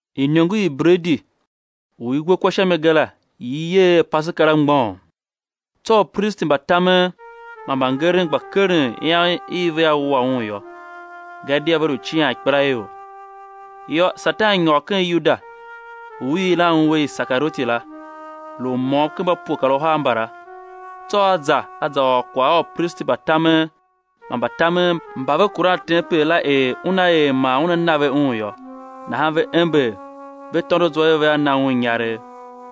Iniongo i bredi u i we kwa sha mi ga la i i yer er Paseka la mgbôghom. Tsô upristi mbatamen man mbangeren gba keren ian i vea wua Un yô; gadia ve lu cian ikpelaior. Yô, Satan nyôr ken Yuda u i yilan un er Isekarioti la, lu u môm ken mba pue kar uhar mbala. Tsô a za a za ôr kwagh a upristi mba tamen man mbatamen mba ve kuran tempel la er una er man una na ve Un yô. Nahan ve ember, ve tôndo zwa er vea na un inyaregh.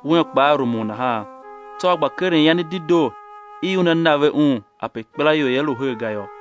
Un kpaa rumun nahan, tsô a gba keren ian i dedoo i una na ve Un ape ikpelaior ia lu her ga yô.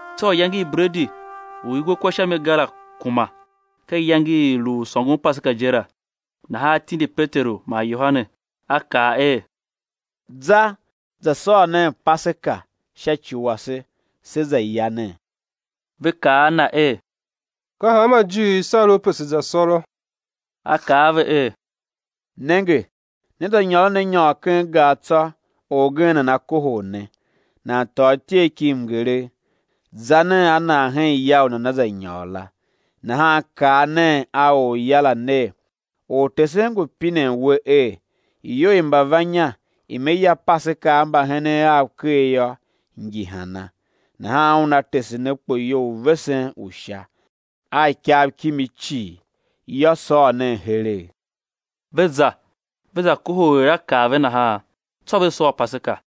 Tsô iyange i bredi u i we kwa sha mi ga la kuma, ka iyange i i lu u sôngon Paseka je la. Nahan A tindi Peteru man Yohane, A kaa er: Za, za sôr nen Paseka sha ci wase, se za ya nen. Ve kaa a Na er: Ka hanma ijiir i sar U pe se̱ za sôrô? A kaa a ve er: Nenge, né za nyôron a nyôr ken gar tsô, orgen nana kohol ne, nan tôô ityegh ki mngeregh; za nen a nan hen ya u nana za nyôr la. Nahan kaa nen a orya la ner: Ortesen ngu pinen we er: Iyou i mbavannya i Me ya Paseka a mbahenen Av ker yô, ngi hana? Nahan una tese ne kpoyou u vesen u sha, a ikav kimi cii yô, sôr nen heregh. Ve za ve za kohol er A kaa ve nahan; tsô ve sôr Paseka.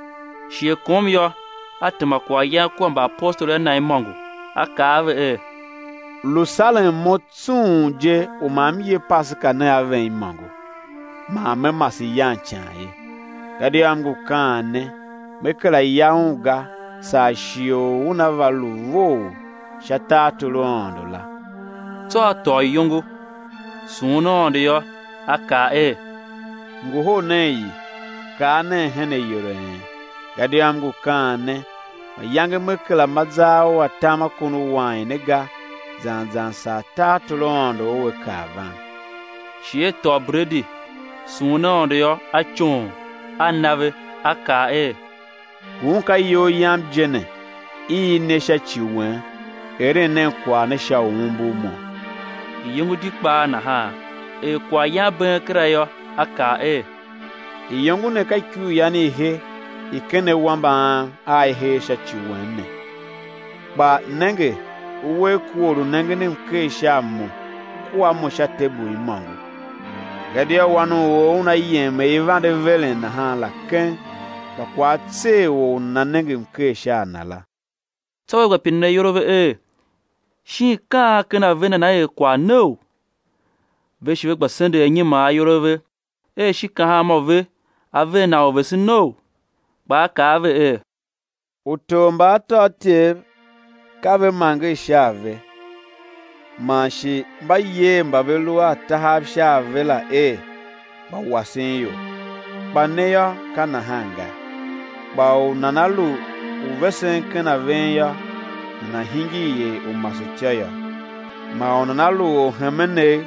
Shighe kom yô, A tema kwaghyan kua mbaapostoli a Na imôngo. A kaa a ve er: Lu saren Mo tsung je u ma M ye Paseka ne a ven imôngo man Me mase yan ican ye. Gadia M ngu kaan ne, Me kera ya un ga, saa shighe u una va lu vough sha tartor u Aôndo la. Tsô A tôô iyongo, sughun Aôndo yô, A kaa er: Ngohol nen i, kar nen hen ayol a en; gadia M ngu kaan ne, mayange Me kera ma zar u atam a kon u wain ne ga zan zan saa tartor u Aôndo ua kar van. Shi A tôô bredi, sughun Aôndo yô, A coon, A na ve, A kaa er: Ngun ka iyol Yam je ne, [i i ne sha ci wen; eren nen kwagh ne sha u umbur Mo. Iyongo di kpaa nahan, er kwaghyan bee kera yô, A kaa er: Iyongo ne ka ikuryan i he i ken awambe Am a i hee sha ci wen ne.] Kpa nenge, uwegh ku or u nengen mker sha a Mo, ku a Mo sha tebul imôngo. Gadia Wan u or Una yem er i vande veren nahan la keng, kpa kwagh á tser or u nana nenge mker sha a Na la. Tsô ve gba pinen ayol a ve er, shin ka an ken a ve nana er kwagh neou? Ve shi ve gba sendegh anyiman ayol a ve er shin ka hanmô ve á ver nan orvesenou? Kpa A kaa a ve er: Utor mba atôatyev ka ve manger sha a ve, man shi mba yer mba ve lu a tahav sha a ve la er mbawasenior. Kpa ne yô, ka nahan ga; kpa u nana lu u vesen ken a ven yô, nana̱ hingir er u masetyô yô; man u nana lu orhemenegh,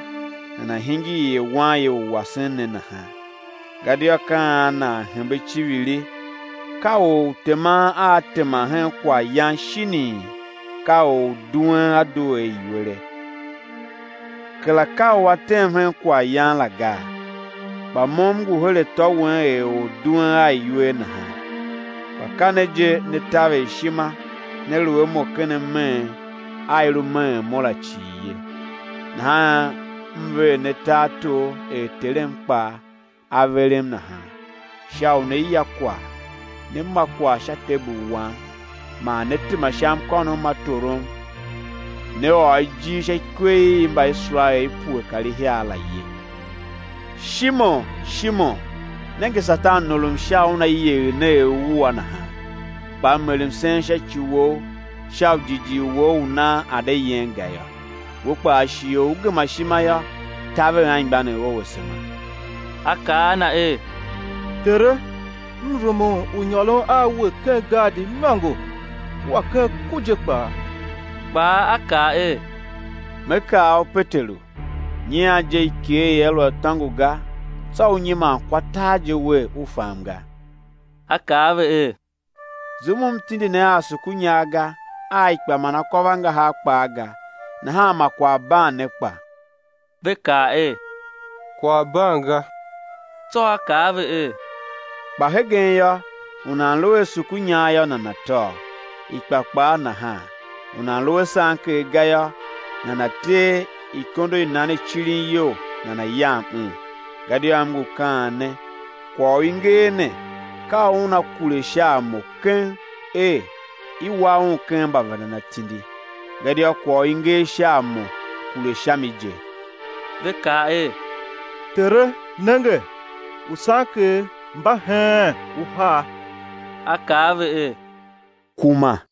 nana̱ hingir er wanye u wasen ne nahan. Gadia ka an nan hembe iciviri, ka or u teman a tema hen kwaghyan, shinii, ka or u duen a due a iwere? Kera ka u a tem hen kwaghyan la gaa? Kpa Mo M ngu her atô wen er or u duen a iwer nahan. Kpa ka ne je ne taver ishima ne lu a Mo ken ameen a i lu meen Mo la cii ye. Nahan M ver ne tartor er Terem kpaa A verem nahan, sha u né ya kwagh, né ma kwagh sha tebul Wam man né tema sha mkônom ma torom, né ôr ijir sha ikwe i Mbaiserael i pue kar ihiar la ye. Shimon! Shimon! Nenge, Satan norom sha u una yegher ne er uwua nahan. Kpa M er msen sha ci wou sha u jighjigh wou u nan a̱ de yen ga yô; we kpaa, shighe u ú gema ishima yô, taver anmgbianev ou asema. A kaa a Na er: Tere, m rumun u nyôron a We ken gaadi imôngo, kua ken ku je kpaa. Kpa A kaa er: Me kaa u Peteru, nyian je ikegh ia lu a tôngo ga, tsô ú nyiman kwa tar je wer, u fam ga. A kaa a ve er: Zum u M tindi ne a asukunyar ga, a ikpa man akôvangahar kpaa ga, nahan ma kwagh ban ne kpa? Ve kaa er: Kwagh ban ga. Tsô A kaa a ve er: Kpa hegen yô, u nan lu a asukunyar yô, nana̱ tôô, ikpa kpaa nahan; u nan lu a sanker ga yô, nana̱ tee ikondo i nan i cirin iyol nana̱ yam un. Gadia M ngu kaan ne, kwagh u i nger ne ka u una kure sha a Mo keng, er: I wa Un ken mbavendan atindi. Gadia kwagh u i nger sha a Mo kure sha mi je. Ve kaa er: Tere, nenge, usanker mba heen uhar. A kaa a ve er: Kuma.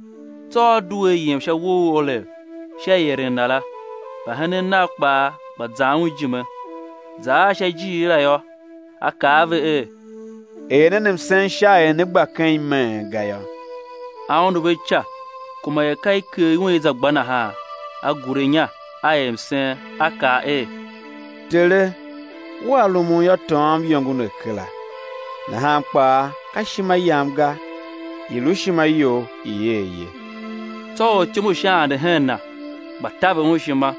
Tsô A due A yem sha uwo u Olev sha ieren Na la; mbahenen Nav kpaa gba zan Un ijime. Za ar sha ijiir la yô, A kaa a ve er: Er nen msen sha er né gba ken imeen ga yô. A undu ve ica kuma er ka i ker iwen i za gba nahan; A gure inya, A er msen, A kaa er: Tere! Wea rumun yô, tôôm iyongo ne kera, nahan kpa ka ishima Yam ga, i̱ lu ishima You i̱ er ye. Tsô ortyom u Sha ande hen Na, gba taver Un ishima.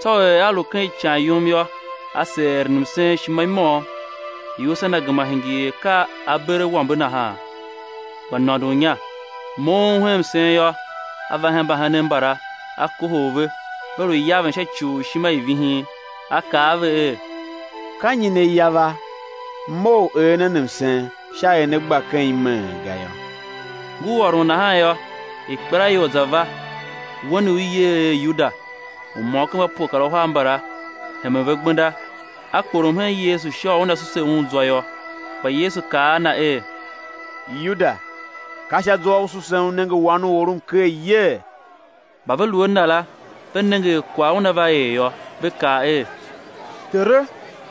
Tsô er A lu ken ican yum yô, A seer eren msen ishima i môm. Iusa Na gema hingir er ka aberawambe nahan, gba nôndon inya. Moughon hen msen yô, A va hen mbahenen mbala, A kohol ve, ve lu yaven sha ci u ishima i vihin. A kaa a ve er: Ka nyi ne yava? Mough, er nen msen sha er né gba ken imeen ga yô. Ngur ôron nahan yô, ikpelaior za va, wen u i yer er Yuda, u môm ken mba pue kar uhar mbala, hemen ve gbenda; a kporom hen Yesu sha u una suse Un zwa yô. Kpa Yesu kaa a na er: Yuda, ka sha zwa u susen u nenge Wan u or mker yee? Mba ve lu a Na la ve nenge er kwagh una va er yô, ve kaa er: Tere,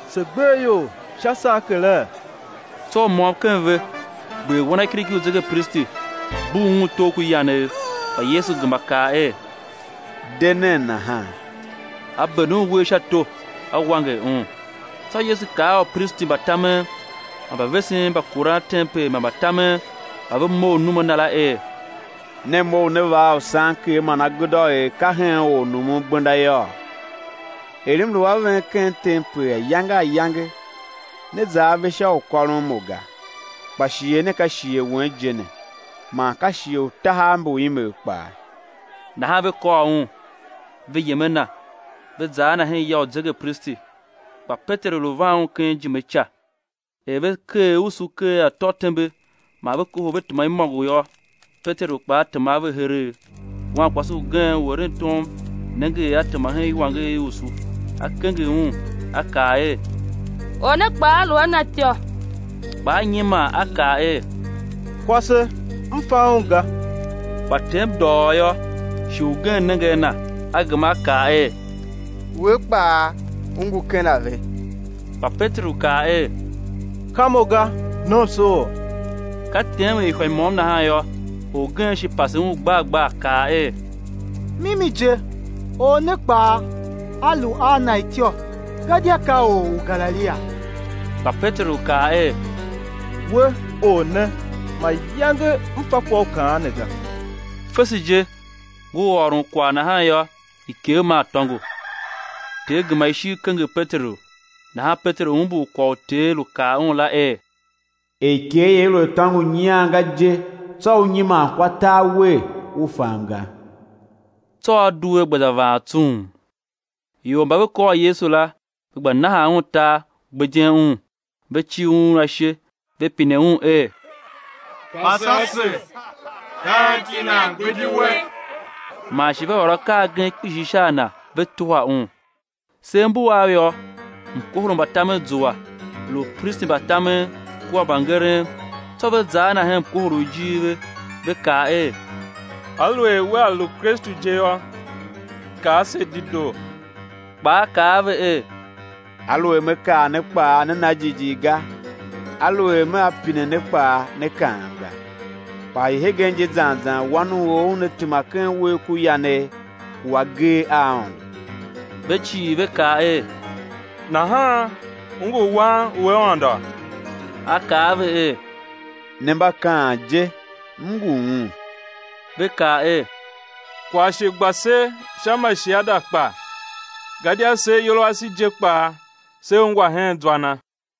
se gber ior sha sankere? Tsô u môm ken ve gber wanakiriki u zegepristi, bugh un togh ku yanegh. Kpa Yesu gema kaa er: De nen nahan. A bende un uwegh sha to, A wanger un. Tsô Yesu kaa a upristi mba tamen man mbavesen mba kuran tempel man mbatamen mba ve mough num a Na la, er: Ne mough ne va a usanker man agudô er ka hen ornumungbenda yôô? Er M lu a ven ken tempel ayange ayange, ne za ave sha u kôron Mo ga; kpa shighe ne ka shighe wen je ne, man ka shighe u tahav mbu imegh kpaa. Nahan ve kôr Un, ve yem a Na, ve za a Na hen ya u zegepristi. Kpa Peteru lu van ken ijime ica. Er ve keer usu ker atô tembe man ve kohol ve tema imôngo yô, Peteru kpaa tema a ve heregh. Wankwase ugen u eren tom nenge er a tema hen iwanger i usu, a kenger un, a kaa er: Or ne kpaa a lu a Na ityô! Kpa a nyiman a kaa er: Kwase, m fa Un ga! Kpa tem dôghôô yô, shi ugen nenge a na, a gema a kaa er: We kpaa u ngu ken a ve. Kpa Peteru kaa er: Ka mo ga, nomsoor! Ka tem er ihwa i môm nahan yô, orgen shi pase un gbar gbar, kaa er: Mimi je, or ne kpaa a lu a Na ityô, gadia ka or u Galilia. Kpa Peteru kaa er: We, or ne, mayange m fa kwagh u u kaan ne ga! Fese je, ngur ôron kwagh nahan yô, ikegh maa tôngo. Ter gema ishigh kenger Peteru; nahan Peteru umbur kwagh u Ter lu kaa un la er: Er ikegh ia lu a tôngo nyian ga je, tsô ú nyiman kwa tar wer, u fam ga. Tsô a due a gba za vaan tsung. Ior mba ve kôr Yesu la ve gba nahan Un tar, gbidyen Un. Ve cir Un ashe, ve pine Un er: Pase ase, ka anti nan gbidi We? Man shi ve ôr akaa agen kpishi sha a Na, ve tuhwa Un. Sev mbu av yô, mkohol u mbatamen zua, lu upristi mba tamen kua mbangeren; tsô ve za a Na hen mkohol u ijir ve. Ve kaa er: Aluer Wea lu Kristu je yô, kaa se dedoo. Kpa A kaa a ve er: Aluer Me kaa ne kpaa, né na jighjigh ga; aluer Mea pine ne kpaa, né kaam ga. Kpa hii hegen je zan zan Wan u or Una tema ken uwegh ku yanegh ku agee a Aôndo. Ve cii ve kaa er: Nahan U ngu Wan u Aôndo? A kaa a ve er: Ne mba kaan je, M ngu Un. Ve kaa er: Kwagh shi gba se sha ma shiada kpa? Gadia se ayol ase je kpaa, se ungwa hen zwa Na.